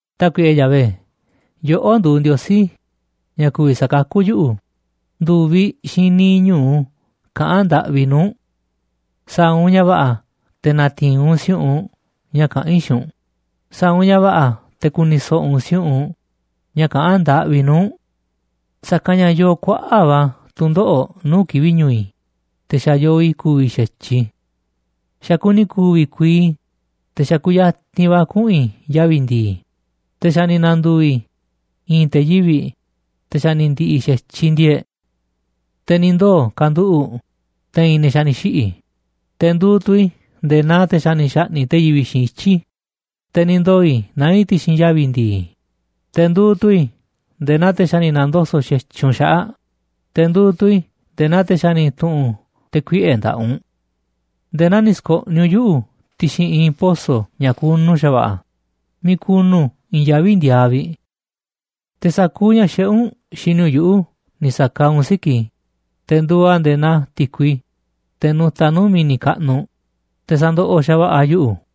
Tákuiꞌe Yahvé, yoꞌó nduuꞌ Ndiosí ña̱ ku̱vi̱ sakakú yuꞌu̱, ndu̱viꞌ xiinꞌ niiꞌ ñu̱u kaꞌán ndaꞌvi i̱ nuu̱ꞌ u̱nꞌ. Sa̱a̱ u̱nꞌ ña̱ va̱ꞌa̱ te̱ na̱ti̱i̱n u̱nꞌ si̱u̱ꞌunꞌ ña̱ kaꞌán i̱ xiinꞌ u̱nꞌ, sa̱a̱ u̱nꞌ ña̱ va̱ꞌa̱ te̱ ku̱ni̱ so̱ꞌo̱ u̱nꞌ si̱u̱ꞌunꞌ ña̱ kaꞌán ndaꞌvi i̱ nuu̱ꞌ u̱nꞌ. Sa̱kanꞌ ña̱ yoo kuaꞌa̱ꞌ va̱ tu̱ndoꞌo̱ꞌ nuu̱ꞌ kivi̱ꞌ ñu̱u̱ i̱, te̱ xa̱ yoo i̱ ku̱vi̱ xa̱tyiꞌ i̱. Xa̱ kuni ku̱vi̱ kuii i̱, te̱ xa̱ kuyatinꞌ va̱ kuꞌu̱n i̱ yavi̱ ndi̱i̱, te̱ xa̱ ni̱ na̱ndu̱u̱ i̱ i̱i̱n te̱ yivi̱ꞌ, te̱ xa̱ ni̱ ndi̱ꞌi̱ xa̱tyiꞌ ndi̱e̱e̱ꞌ. Te̱ ni̱ ndoo̱ kanduꞌu̱ꞌ te̱i̱n ne̱ xa̱ ni̱ xiꞌi̱, te̱ nduuꞌ tu̱ i̱ nde̱e̱ naa te̱ xa̱ ni̱ xa̱ꞌni̱ꞌ te̱ yivi̱ꞌ xiinꞌ ityi̱, te̱ ni̱ ndoo̱ i̱ naá i̱ ti̱xi̱n yavi̱ ndi̱i̱, te̱ nduuꞌ tu̱ i̱ nde̱e̱ naa te̱ xa̱ ni̱ na̱ndoso̱ꞌ xa̱tyiꞌ u̱nꞌ xaꞌa̱ꞌ, te̱ nduuꞌ tu̱ i̱ nde̱e̱ naa te̱ xa̱ ni̱ tu̱ꞌu̱n te̱ kuiꞌe̱ nda̱ꞌaꞌ u̱nꞌ. Nde̱e̱ naa ni̱ sko̱ꞌniꞌ u̱nꞌ yuꞌu̱ ti̱xi̱n i̱i̱n poso̱ ña̱ kunu xa̱va̱ꞌa̱, miiꞌ kunu i̱i̱n yaví ndiaaꞌ vi̱ꞌ. Te̱ sa̱kuuꞌ ña̱ xiꞌé u̱nꞌ xini u̱nꞌ yuꞌu̱ ni̱ sa̱kaaꞌ u̱nꞌ siki̱ꞌ i̱, te̱ nduuꞌ a̱ nde̱e̱ naa ti̱kui, teꞌ nutaꞌ nuu̱ꞌ mi̱ni̱ kaꞌnuꞌ, te̱ sandoꞌoꞌ xa̱va̱ꞌa̱ a̱ yuꞌu̱.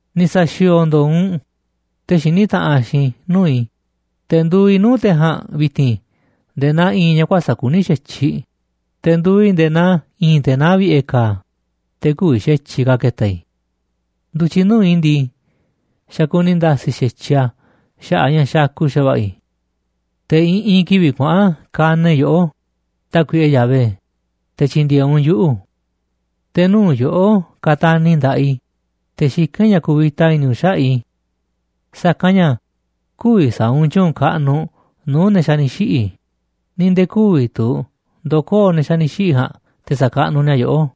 Ni̱ sa̱xi̱o̱o̱ ndo̱o̱ u̱nꞌ te̱ xiní taꞌanꞌ xiinꞌ i̱ nuu̱ꞌ i̱, te̱ nduuꞌ i̱ nuu̱ꞌ te̱ ja̱a̱nꞌ vi̱ti̱n nde̱e̱ naa i̱i̱n ña̱ kuäsa̱ꞌ kuní xa̱tyiꞌ, te̱ nduuꞌ i̱ nde̱e̱ naa i̱i̱n te̱ naá vi̱ꞌe̱ ka̱a̱, te̱ kü̱vi̱ xa̱tyiꞌ ka̱ ke̱ta̱. Ndu̱tyiꞌ nuu̱ꞌ i̱ ndii, xa̱ kuni nda̱si̱ xa̱tyiꞌ a̱ xaꞌa̱ꞌ a̱ ña̱ xakuꞌ xa̱va̱ꞌa̱ i̱. Te̱ i̱ꞌi̱n kivi̱ꞌ kuaꞌa̱n kanaꞌ i̱ yoꞌó, Tákuiꞌe Yahvé, te̱ tyi̱ndi̱e̱eꞌ u̱nꞌ yuꞌu̱. Te̱ nuu̱ꞌ yoꞌó kataniꞌ i̱ nda̱ꞌaꞌ i̱, te̱ xikán i̱ ña̱ ku̱vi̱ta i̱ni̱ u̱nꞌ xaꞌa̱ꞌ i̱. Sa̱kanꞌ ña̱ kü̱vi̱ sa̱a̱ u̱nꞌ tyu̱u̱n kaꞌnuꞌ nuu̱ꞌ ne̱ xa̱ ni̱ xiꞌi̱, ni̱ nde̱e̱ kü̱vi̱ tu̱ ndo̱koo̱ ne̱ xa̱ ni̱ xiꞌi̱ ja̱a̱nꞌ te̱ sa̱kaꞌnuꞌ ni̱a̱ yoꞌó.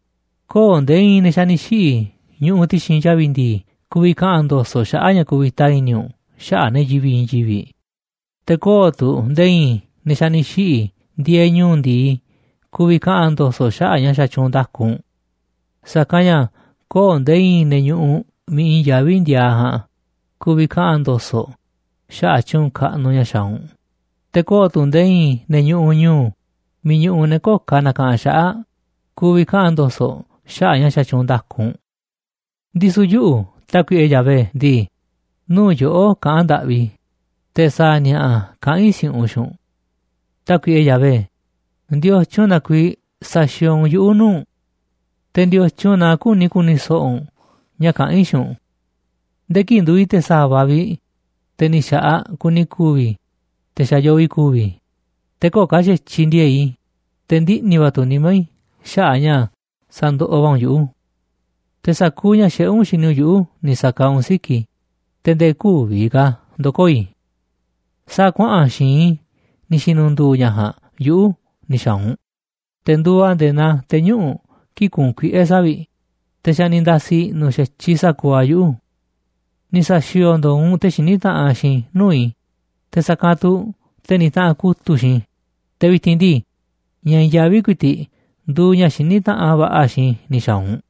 Köo̱ꞌ nde̱e̱ i̱i̱n ne̱ xa̱ ni̱ xiꞌi̱ ñuꞌuꞌ ti̱xi̱n yavi̱ ndi̱i̱ ku̱vi̱ kaꞌa̱n ndo̱so̱ꞌ xaꞌa̱ꞌ ña̱ kuvita i̱ni̱ u̱nꞌ xaꞌa̱ꞌ ne̱ yivi̱ꞌ i̱i̱n yivi̱ꞌ, te̱ köo̱ꞌ tu̱ nde̱e̱ i̱i̱n ne̱ xa̱ ni̱ xiꞌi̱ ndieeꞌ ñu̱u̱ ndi̱i ku̱vi̱ kaꞌa̱n ndo̱so̱ꞌ xaꞌa̱ꞌ ña̱ xatyuunꞌ nda̱ku u̱nꞌ. Sa̱kanꞌ ña̱ köo̱ꞌ nde̱e̱ i̱i̱n ne̱ ñuꞌuꞌ miiꞌ i̱i̱n yaví ndiaaꞌ ja̱a̱nꞌ ku̱vi̱ kaꞌa̱n ndo̱so̱ꞌ xaꞌa̱ꞌ tyu̱u̱n kaꞌnuꞌ ña̱ xaaꞌ u̱nꞌ, te̱ köo̱ꞌ tu̱ nde̱e̱ i̱i̱n ne̱ ñuꞌuꞌ ñu̱u̱ miiꞌ ñuꞌuꞌ ne̱ köo̱ꞌ ka̱ nakaꞌanꞌ xaꞌa̱ꞌ ku̱vi̱ kaꞌa̱n ndo̱so̱ꞌ xaꞌa̱ꞌ ña̱ xatyuunꞌ nda̱ku u̱nꞌ. Ndisu̱ yuꞌu̱, Tákuiꞌe Yahvé ndii, nuu̱ꞌ yoꞌó kaꞌán ndaꞌvi i̱, te̱ sa̱a̱ ni̱a̱ꞌa̱ kaꞌán i̱ si̱u̱ꞌunꞌ xiinꞌ u̱nꞌ. Tákuiꞌe Yahvé, ¿ndiotyun na kuiiꞌ saxiooꞌ u̱nꞌ yuꞌu̱ nuu̱ꞌ u̱nꞌ? Te̱, ¿ndiotyun na küni ku̱ni̱ so̱ꞌo̱ u̱nꞌ ña̱ kaꞌán i̱ xiinꞌ u̱nꞌ? Nde̱e̱ kii̱ꞌ nduuꞌ i̱ te̱ sa̱va̱ vi̱ꞌ, te̱ ni̱ xa̱ꞌaꞌ kuni ku̱vi̱ i̱, te̱ xa̱ yoo i̱ ku̱vi̱ i̱, te̱ köo̱ꞌ ka̱ xa̱tyiꞌ ndi̱e̱e̱ꞌ i̱, te̱ ndiꞌni̱ va̱ tu̱ nimá i̱ xaꞌa̱ꞌ ña̱ sandoꞌoꞌ va̱ u̱nꞌ yuꞌu̱. Te̱ sa̱kuuꞌ ña̱ xiꞌé u̱nꞌ xini u̱nꞌ yuꞌu̱ ni̱ sa̱kaaꞌ u̱nꞌ siki̱ꞌ i̱, te̱ nde̱e̱ kü̱vi̱ ka̱ ndo̱koo̱ i̱. Sa̱a̱ kuaꞌa̱n xi̱i̱nꞌ i̱ ni̱ xi̱nu̱ndu̱u̱ ña̱ ja̱a̱nꞌ yuꞌu̱ ni̱ xa̱a̱ u̱nꞌ, te̱ nduuꞌ a̱ nde̱e̱ naa te̱ñuꞌu̱ꞌ kii̱ꞌ kuunꞌ kuiꞌe̱ savi̱ꞌ, te̱ xa̱ ni̱ nda̱si̱ i̱ꞌnu̱ xa̱tyiꞌ sa̱kuuꞌ a̱ yuꞌu̱. Ni̱ sa̱xi̱o̱o̱ ndo̱o̱ u̱nꞌ te̱ xiní taꞌanꞌ xiinꞌ nuu̱ꞌ i̱, te̱ sa̱kanꞌ tu̱ te̱ nitaꞌanꞌ kutu̱ꞌ xiinꞌ i̱, te̱ vi̱ti̱n ndii, ña̱ i̱i̱n yaví ku̱i̱ti̱ꞌ nduuꞌ ña̱ xiní taꞌanꞌ va̱ꞌa̱ xiinꞌ i̱ ni̱ xa̱a̱ u̱nꞌ.